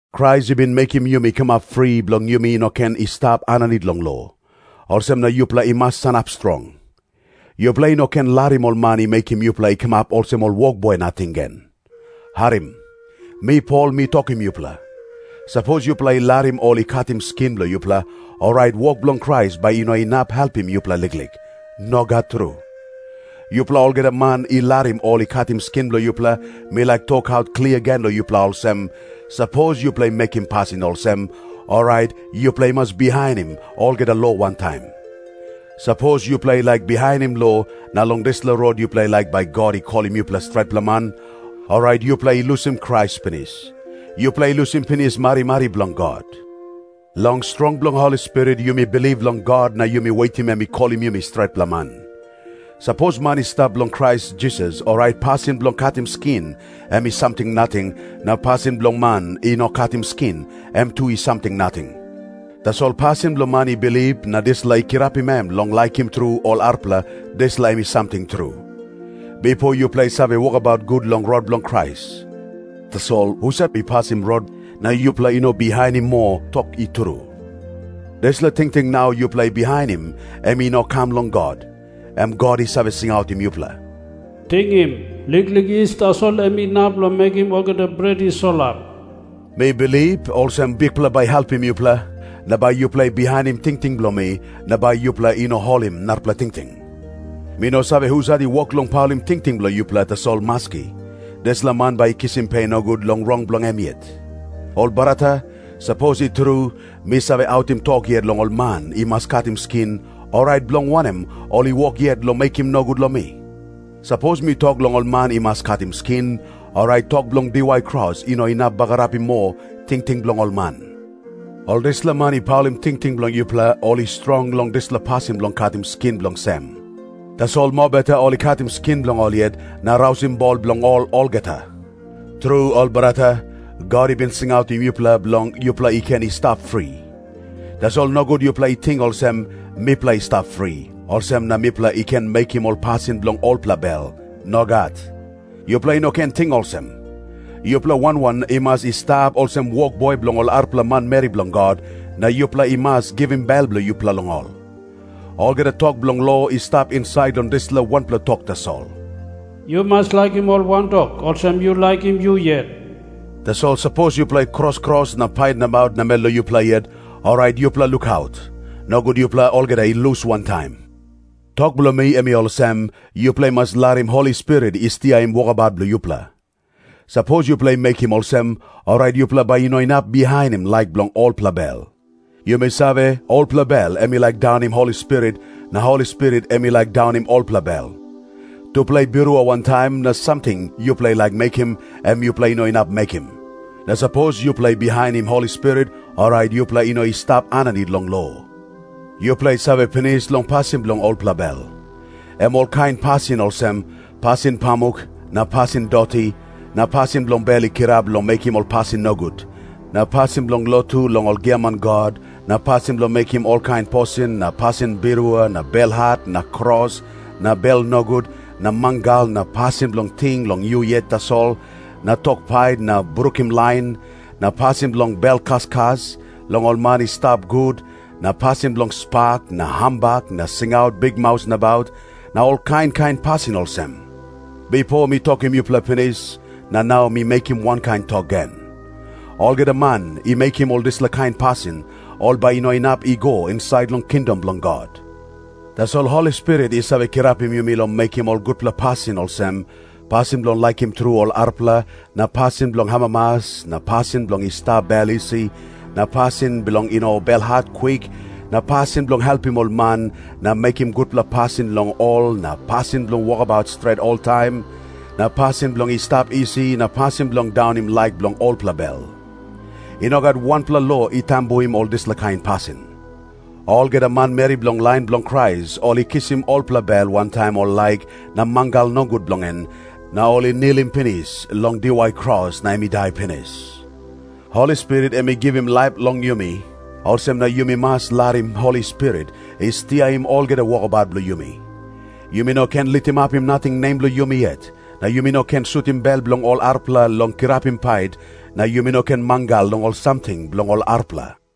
Krais i bin mekim yumi i kamap fri, bilong yumi no ken i stap aninit long lo. Olsem na yupela i mas sanap strong. Yupela i no ken larim ol man i mekim yupela i kamap olsem ol wokboi nating gen. Harim. Mi Pol mi tokim yupela, sapos yupela i larim ol i katim skin bilong yupela, orait wok bilong Krais bai i no inap helpim yupela liklik. Nogat tru. Yupela olgeta man i larim ol i katim skin bilong yupela, mi laik tokaut klia gen long yupela olsem, sapos yupela i mekim pasin olsem, orait yupela i mas bihainim olgeta lo wantaim. Sapos yupela i laik bihainim lo, na long dispela rot yupela i laik bai God i kolim yupela stretpela man, orait yupela i lusim Krais pinis. Yupela i lusim pinis marimari bilong God. Long strong bilong Holi Spirit yumi bilip long God na yumi wetim em i kolim yumi stretpela man. Sapos man i stap long Krais Jisas, orait pasin bilong katim skin em i samting nating, na pasin bilong man i no katim skin, em tu i samting nating. Tasol pasin bilong man i bilip na dispela i kirapim em long laikim tru ol arapela, dispela em i samting tru. Bipo yupela i save wokabaut gut long rot bilong Krais. Tasol husat i pasim rot na yupela i no bihainim moa tok i tru? Dispela tingting nau yupela i bihainim em i no kam long God, em God i save singautim yupela. Tingim. Liklik yis tasol em inap long mekim olgeta bret i solap. Mi bilip olsem Bikpela bai i helpim yupela, na bai yupela i bihainim tingting bilong mi, na bai yupela i no holim narapela tingting. Mi no save husat i wok long paulim tingting bilong yupela, tasol maski, dispela man bai i kisim pe nogut long rong bilong em yet. Ol brata, sapos i tru mi save autim tok yet long ol man i mas katim skin, orait bilong wanem ol i wok yet long mekim nogut long mi? Sapos mi tok long ol man i mas katim skin, orait tok bilong diwai kros i no inap bagarapim moa tingting bilong ol man. Ol dispela man i paulim tingting bilong yupela, ol i strong long dispela pasin bilong katim skin bilong sem. Tasol mobeta ol i katim skin bilong ol yet na rausim bol bilong ol olgeta. Tru, ol brata, God i bin singautim yupela bilong yupela i ken i stap fri. Tasol nogut yupela i ting olsem, “Mipela i stap fri, olsem na mipela i ken mekim ol pasin bilong olpela bel.” Nogat. Yupela i no ken ting olsem. Yupela wan wan i mas i stap olsem wokboi bilong ol arapela manmeri bilong God, na yupela i mas givim bel bilong yupela long ol. Olgeta tok bilong lo i stap insait long dispela wanpela tok tasol, “Yu mas laikim ol wantok olsem yu laikim yu yet.” Tasol sapos yupela i kros kros na pait nabaut namel long yupela yet, orait yupela lukaut. Nogut yupela olgeta i lus wantaim. Tok bilong mi em i olsem, yupela i mas larim Holi Spirit i stiaim wokabaut bilong yupela. Sapos yupela i mekim olsem, orait yupela bai i no inap bihainim laik bilong olpela bel. Yumi save, olpela bel em i laik daunim Holi Spirit, na Holi Spirit em i laik daunim olpela bel. Tupela i birua wantaim, na samting yupela i laik mekim, em yupela i no inap mekim. Na sapos yupela i bihainim Holi Spirit, orait yupela i no i stap aninit long lo. Yupela i save pinis long pasin bilong olpela bel. Em olkain pasin olsem, pasin pamuk na pasin doti na pasin bilong bel i kirap long mekim ol pasin nogut, na pasin bilong lotu long ol giaman god na pasin bilong mekim olkain posin na pasin birua na belhat na kros na bel nogut na mangal na pasin bilong ting long yu yet tasol na tok pait na brukim lain, na pasin bilong bel kaskas long ol man i stap gut na pasin bilong spak na hambak na singaut bikmaus nabaut, na ol kain kain pasin olsem. Bipo mi tokim yupela pinis, na nau mi mekim wankain tok gen. Olgeta man i mekim ol dispela kain pasin, ol bai i no inap i go insait long kingdom bilong God. Tasol Holi Spirit i save kirapim yumi long mekim ol gutpela pasin olsem, pasin bilong laikim tru ol arapela na pasin bilong amamas na pasin bilong i stap bel isi na pasin bilong i no belhat kwik na pasin bilong helpim ol man na mekim gutpela pasin long ol na pasin bilong wokabaut stret oltaim na pasin bilong i stap isi na pasin bilong daunim laik bilong olpela bel. I no gat wanpela lo i tambuim ol dispela kain pasin. Olgeta manmeri bilong lain bilong Krais ol i kisim olpela bel wantaim ol laik na mangal nogut bilong en, na ol i nilim pinis long diwai kros na em i dai pinis. Holi Spirit em i givim laip long yumi, olsem na yumi mas larim Holi Spirit i stiaim olgeta wokabaut bilong yumi. Yumi no ken litimapim nating nem bilong yumi yet, na yumi no ken sutim bel bilong ol arapela long kirapim pait, na yumi no ken mangal long ol samting bilong ol arapela.